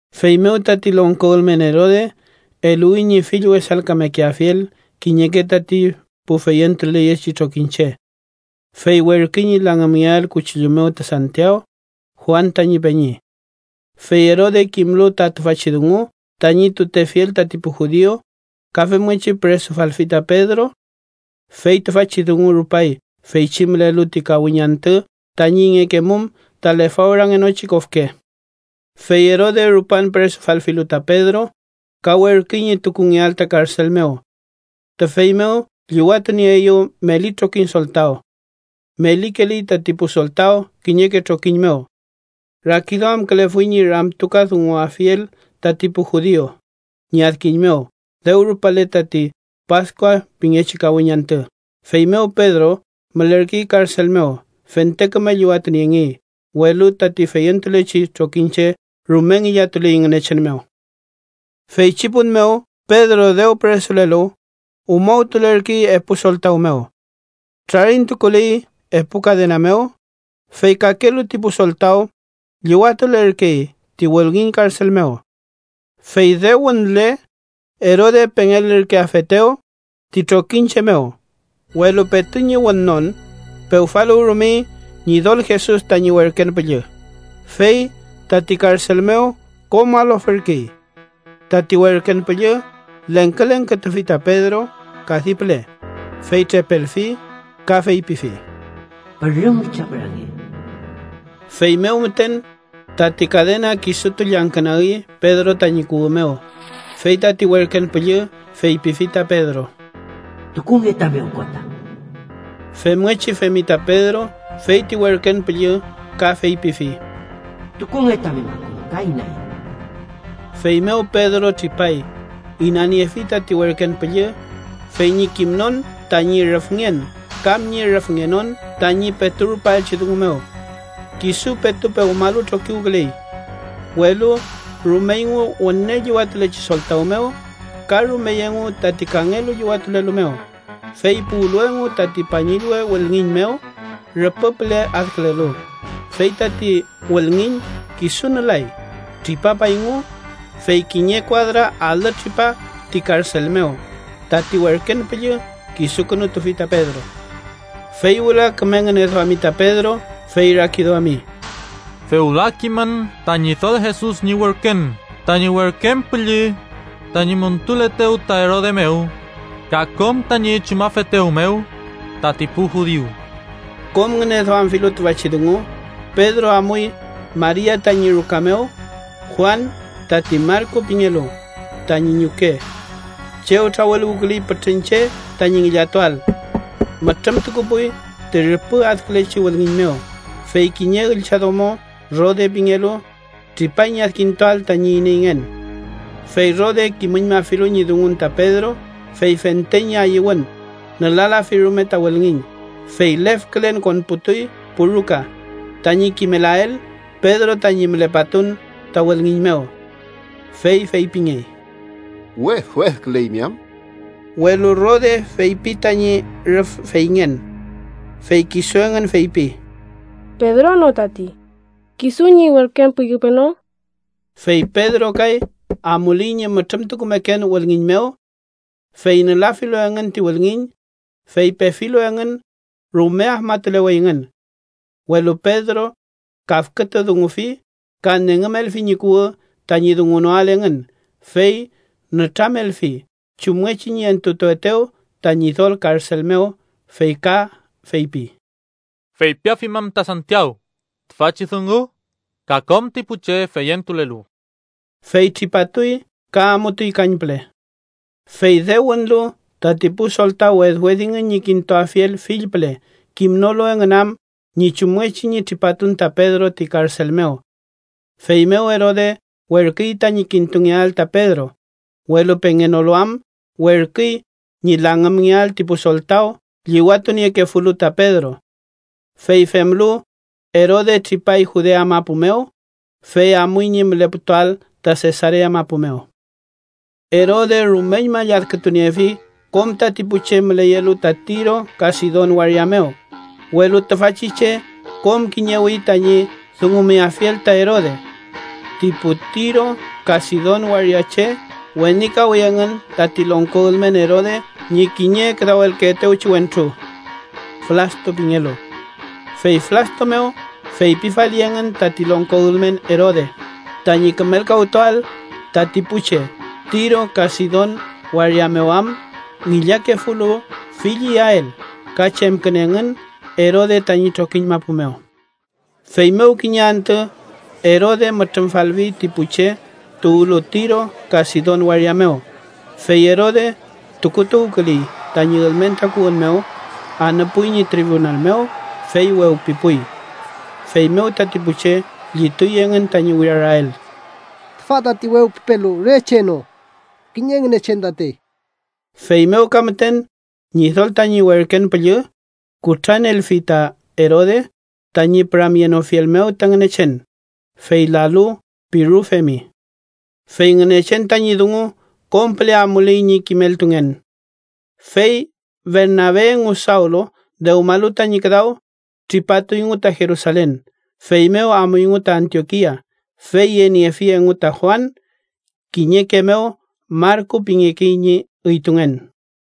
Feymew tati longko ülmen Erode eluwi ñi fill wesalkamekeafiel kiñeke tati pu feyentuleyechi trokiñche. Fey werküy ñi langümngeael kuchillu mew ta Santiaw, Juan tañi peñi. Fey Erode kimlu ta tüfachi dungu mew tañi tutefiel tati pu judiu, ka femngechi püresufalfi ta Pedro. Fey tüfachi dungu rupay feychi mülelu ti kawiñ antü tañi ingekemum ta lefawrangenochi kofke. Fey Erode rupan püresufalfilu ta Pedro, ka werküy ñi tukungeael ta karsel mew. Tüfey mew llüwatunieeyew meli trokiñ soltaw. Melikeley tati pu soltaw kiñeke trokiñ mew. Rakiduamkülefuy ñi ramtukadunguafiel tati pu judiu ñi adkiñ mew dew rupale tati Paskua pingechi kawiñ antü. Feymew Pedro mülerkey karsel mew, fente küme llüwatuniengey, welu tati feyentulechi trokiñche rume ngillatuley Ngünechen mew. Feychi pun mew Pedro dew püresulelu, umawkülerkey epu soltaw mew. Trarintukuley epu kadena mew, fey kakelu ti pu soltaw llüwatulerkey ti wülngiñ karsel mew. Fey dew wünle, Erode pengelürkeafetew ti trokiñche mew, welu petu ñi wünnon, pewfaluwrumey Ñidol Jesus tañi werken püllü, fey tati karsel mew kom alofürkey. Tati werken püllü lengkülengkütufi ta Pedro kadi püle, fey trepelfi, ka feypifi: —¡Pürüm witrapürange! Feymew müten, tati kadena kisutu llangkünagi Pedro tañi kuwü mew, fey tati werken püllü feypifi ta Pedro: —Tukunge tami okota. Femngechi femi ta Pedro, fey ti werken püllü ka feypifi: —Tukunge tami makuñ ka inaen. Feymew Pedro tripay, inaniefi tati werken püllü, fey ñi kimnon tañi rüfngen kam ñi rüfngenon tañi petu rupaelchi dungu mew. Kisu petu pewmalu trokiwküley. Welu rumeyngu wüne llüwatulechi soltaw mew, ka rumey engu tati kangelu llüwatulelu mew, fey puwlu engu tati pañillwe wülngiñ mew, rüpü püle adkülelu, fey tati wülngiñ kisu nülay. Tripapayngu, fey kiñe kuadra alü tripa ti karsel mew, tati werken püllü kisukünutufi ta Pedro. Fey wüla küme ngüneduami ta Pedro, fey rakiduami: “Fewla kimün ta Ñidol Jesus ñi werkün tañi werken püllü tañi montuletew ta Erode mew ka kom tañi chumafetew mew tati pu judiu.” Kom ngüneduamfilu tüfachi dungu, Pedro amuy Maria tañi ruka mew (Juan, tati Marku pingelu, tañi ñuke) chew trawüluwküley pütrün che tañi ngillatuael. Mütrümtukupuy ti rüpü adkülechi wülngiñ mew, fey kiñe üllchadomo, Rode pingelu, tripay ñi adkintuael tañi ineyngen. Fey Rode kimüñmafilu ñi dungun ta Pedro, fey fente ñi ayüwün nülalafi rume ta wülngiñ, fey lefkülen konputuy pu ruka tañi kimelael Pedro tañi mülepatun ta wülngiñ mew. Fey feypingey: —¡Wedwedküleymi am! Welu Rode feypi tañi rüf feyngen. Fey kisu engün feypi. —¡Pedro no tati! ¿Kisu ñi werken püllü peno? Fey Pedro kay amuley ñi mütrümtukumeken wülngiñ mew. Fey nülafilu engün ti wülngiñ, fey pefilu engün, rume afmatuleweyngün. Welu Pedro kafkütudungufi ka nengümelfi ñi kuwü tañi dungunoael engün, fey nütramelfi chumngechi ñi entutuetew ta Ñidol karsel mew. Fey ka feypi: —Feypiafimün ta Santiaw tüfachi dungu ka kom ti pu che feyentulelu. Fey tripatuy ka amutuy kañpüle. Fey dew wünlu, tati pu soltaw wedwedingün ñi kintuafiel fill püle, kimnolu engün am ñi chumngechi ñi tripatun ta Pedro ti karsel mew. Feymew Erode werküy tañi kintungeael ta Pedro, welu pengenolu am, werküy ñi langümngeael ti pu soltaw llüwatuniekefulu ta Pedro. Fey femlu, Erode tripay Judea mapu mew, fey amuy ñi müleputuael ta Sesarea mapu mew. Erode rumeñma lladkütuniefi kom tati pu che müleyelu ta Tiro ka Sidon waria mew, welu tüfachi che kom kiñewi tañi dungumeafiel ta Erode mew. Ti pu Tiro ka Sidon waria che wenikawi engün tati longko ülmen Erode ñi kiñe küdawelkeetewchi wentru, Blasto pingelu. Fey Blasto mew feypifali engün tati longko ülmen Erode tañi kümelkawtuael, tati pu che Tiro ka Sidon waria mew am ngillakefulu fill iyael ka chemkün engün Erode tañi trokiñ mapu mew. Feymew kiñe antü Erode mütrümfalfi ti pu che tuwlu Tiro ka Sidon waria mew, fey Erode tukutuwküley tañi ülmen takuwün mew, anüpuy ñi tribunal mew, fey wewpipuy. Feymew tati pu che llituy engün tañi wirarael: “¡Tüfa tati wewpipelu re che no, kiñe ngünechen tatey!” Feymew ka müten, Ñidol tañi werken püllü kutranelfi ta Erode, tañi püramyenofiel mew ta Ngünechen, fey lalu, pirufemi. Fey Ngünechen tañi dungu kom püle amuley ñi kimeltungen. Fey Bernabe engu Sawlu dewmalu tañi küdaw, tripatuyngu ta Jerusalen, feymew amuyngu ta Antiokia, fey yeniefi engu ta Juan, kiñeke mew Marku pingekey ñi üytungen.